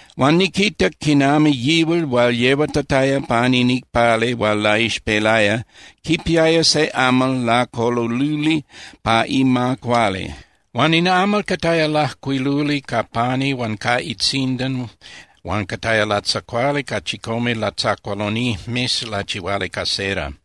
Huan niquitac quinami yihual hual yehuatataya pan in icpali hual laixpelaya quipiaya se amal lacololuli pa ima cuali. Huan in amal cataya lajcuiluli ca pani huan ca itzindan huan cataya latzacuali ca chicome latzacualonijmes lachihuali ca cera.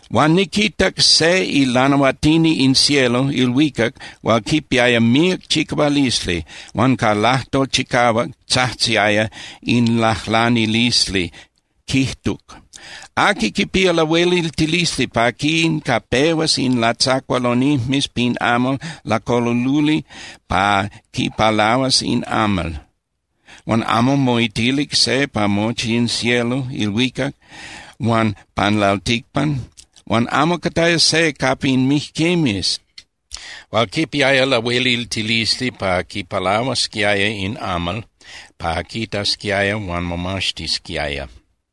Huan niquitac se ilanahuatini in cielo (ilhuicac) hual quipiaya míac chicahualisli huan ca lajtol chicahuac tzajtziaya in lajlanilisli, quijtuc: —¿Aqui quipía lahueliltilisli pa quincapehuas in latzacualonijmes pin amal lacololuli pa quipalahuas in amal? Huan amo moitilic se pa mochi in cielo (ilhuicac) huan pan lalticpan huan amo cataya se capa in mijquimes hual quipiaya lahueliltilisli pa quipalahuasquiaya in amal pa quitasquiaya huan momaxtisquiaya.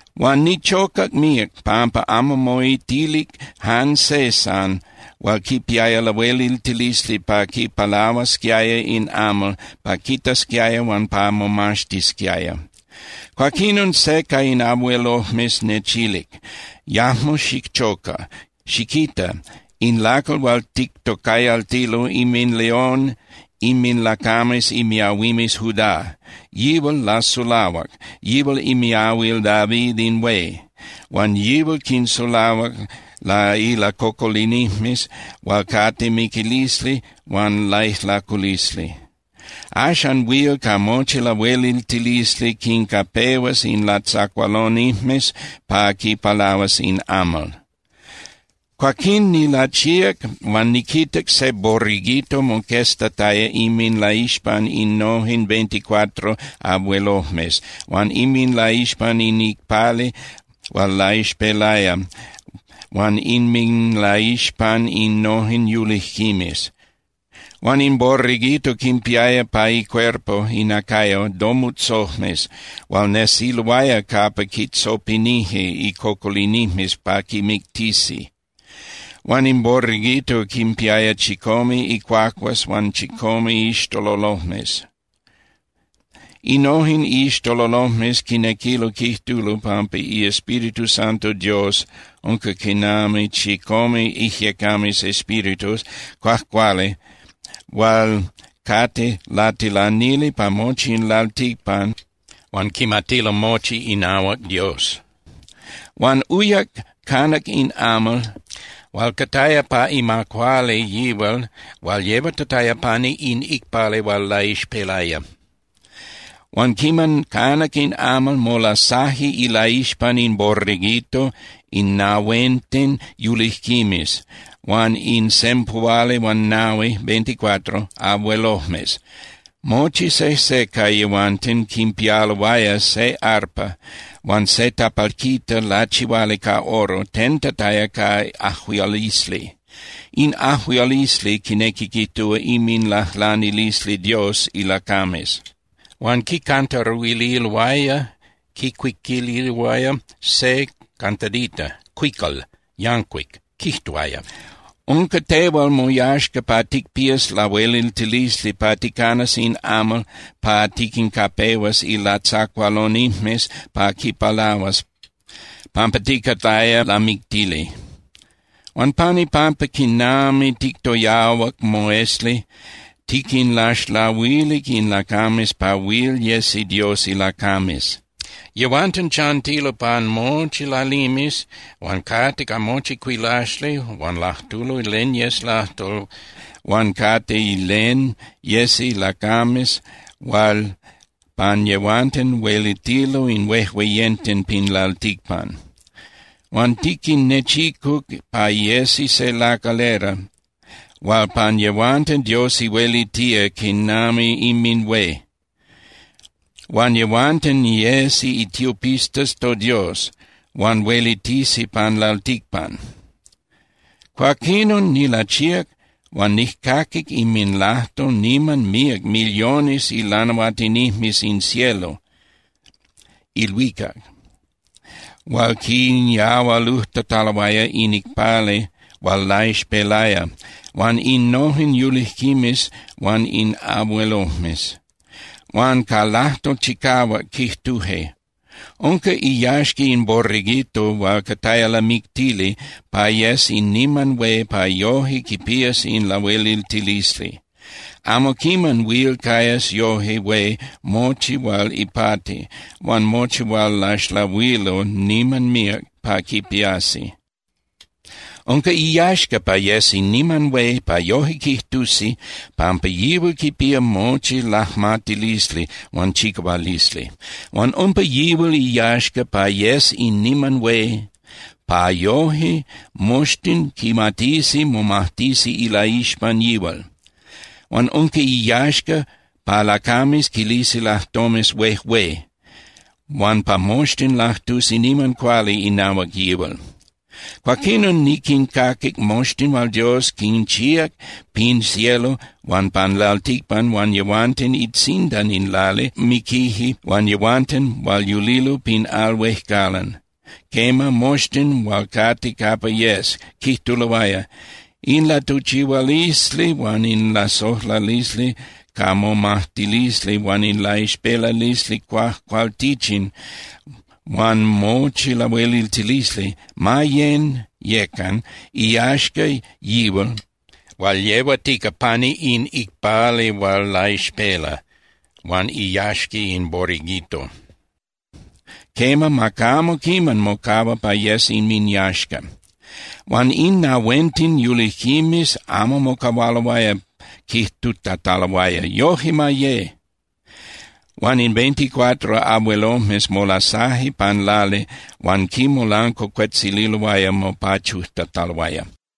Huan nichocac míac pampa amo moitilic jan se san hual quipiaya lahueliltilisli pa quipalahuasquiaya in amal pa quitasquiaya huan pa momaxtisquiaya. Cuaquinon se ca in abuelojmes nechilic: —Yajmo xichoca. Xiquita, in lacal hual tictocayaltilo inminLeón inminlacames imiahuimes Judá, yihual lasulahuac. Yihual imiahuil David in hué, huan yihual quinsulahuac ilacocolinijmes hual cate miquilisli huan laijlaculisli. Axan huil ca mochi lahueliltilisli quincapehuas in latzacualonijmes pa quipalahuas in amal. Cuaquinon nilachíac huan niquitac se Borreguito moqueztataya inminlaixpan innojen veinticuatro abuelojmes huan inminlaixpan in icpali hual laixpelaya huan inminlaixpan innojen yulijquimes. Huan in Borreguito quinpiaya pa icuerpo (inacayo) domutzojmes hual nesiloaya capa quitzopinije icocolinijmes pa quimictisi. Huan in Borreguito quinpiaya chicome icuacuas huan chicome iixtololojmes. Innojen iixtololojmes quinequilo quijtulo pampa iEspíritu Santo Dios unca quinami chicome ijyecames (espíritus) cuajcuali hual cate latilanili pa mochi in lalticpan huan quimatilo mochi inahuac Dios. Huan uyac canac in amal hual cataya pa ima cuali yihual hual yehuatataya pani in icpali hual laixpelaya. Huan quiman canac in amal, molasaje ilaixpan in Borreguito in nahuenten yulijquimes huan in sempuhualihuanahui (veinticuatro) abuelojmes. Mochi sejse ca yehuanten quinpialoaya se arpa huan se tapalquita lachihuali ca oro tentataya ca ajuialisli. In ajuialisli quinequi quijtúa inminlajlanilisli Dios ilacames. Huan quicantaruililoaya (quicuiquililoaya) se cantadita (cuical) yancuic, quijtuaya: Unca tehual moyaxca pa ticpías lahueliltilisli pa ticanas in amal pa tiquincapehuas ilatzacualonijmes pa quipalahuas, pampa ticataya lamictili. Huan pan ipampa quinami tictoyahuac moesli tiquinlaxlahuilic in lacames pa huil yesi Dios ilacames. Yehuanten chantilo pan mochi lalimes huan cate ca mochi cuilaxli huan lajtulo len yes lajtol huan cate len yesi lacames hual pan yehuanten huelitilo in huejueyenten pin lalticpan. Huan tiquinnechicuc pa yesi se lacalera hual pan yehuanten Dios huelitía quinami inminhué. Huan yehuanten yesi itiopistas toDios, huan huelitisi pan lalticpan. Cuaquinon nilachíac huan nijcaquic inminlajtol niman míac millones ilanahuatinijmes in cielo (ilhuicac) hual quinyahualujtataloaya in icpali hual laixpelaya huan innojen yulijquimes huan in abuelojmes. Huan ca lajtol chicahuac quijtuje: Unca iyaxca in Borreguito hual cataya lamictili pa yes in niman hué pa yojque quipías in lahueliltilisli. Amo quiman huil cayas yoje hué mochi hual ipati huan mochi hual laxlahuilo niman míac pa quipiasi. Unca iyaxca pa yes in niman hué pa yoje quijtusi pampa yihual quipía mochi lajmatilisli huan chicahualisli. Huan unca yihual iyaxca pa yes in niman hué pa yoje moxtin quimatisi momajtisi ilaixpan yihual. Huan unca iyaxca pa lacames quilisi lajtomes huejué, huan pa moxtin lajtusi niman cuali inahuac yihual. Cuaquinon niquincaquic moxtin hual Dios quinchíac pin cielo huan pan lalticpan huan yehuanten itzindan in lali hual miquije huan yehuanten hual yulilo pin al huejcalan, quema, moxtin hual cate capa yes, quijtuloaya: In latuchihualisli huan in lasojlalisli ca momajtilisli huan in laixpelalisli cuajcualtichin huan mochi lahueliltilisli ma yén (yecan) iyaxca yihual hual yehuatica pani in icpali hual laixpela, huan iyaxca in Borreguito. Quema, ma camo quiman mocahua pa yes inminyaxca. Huan in nahuenten yulijquimes amo mocahualoaya quijtutataloaya: —¡Yoje ma ye! Huan in veinticuatro abuelojmes molasaje pan lali huan quinmolancuacuetzililoaya mopachujtataloaya.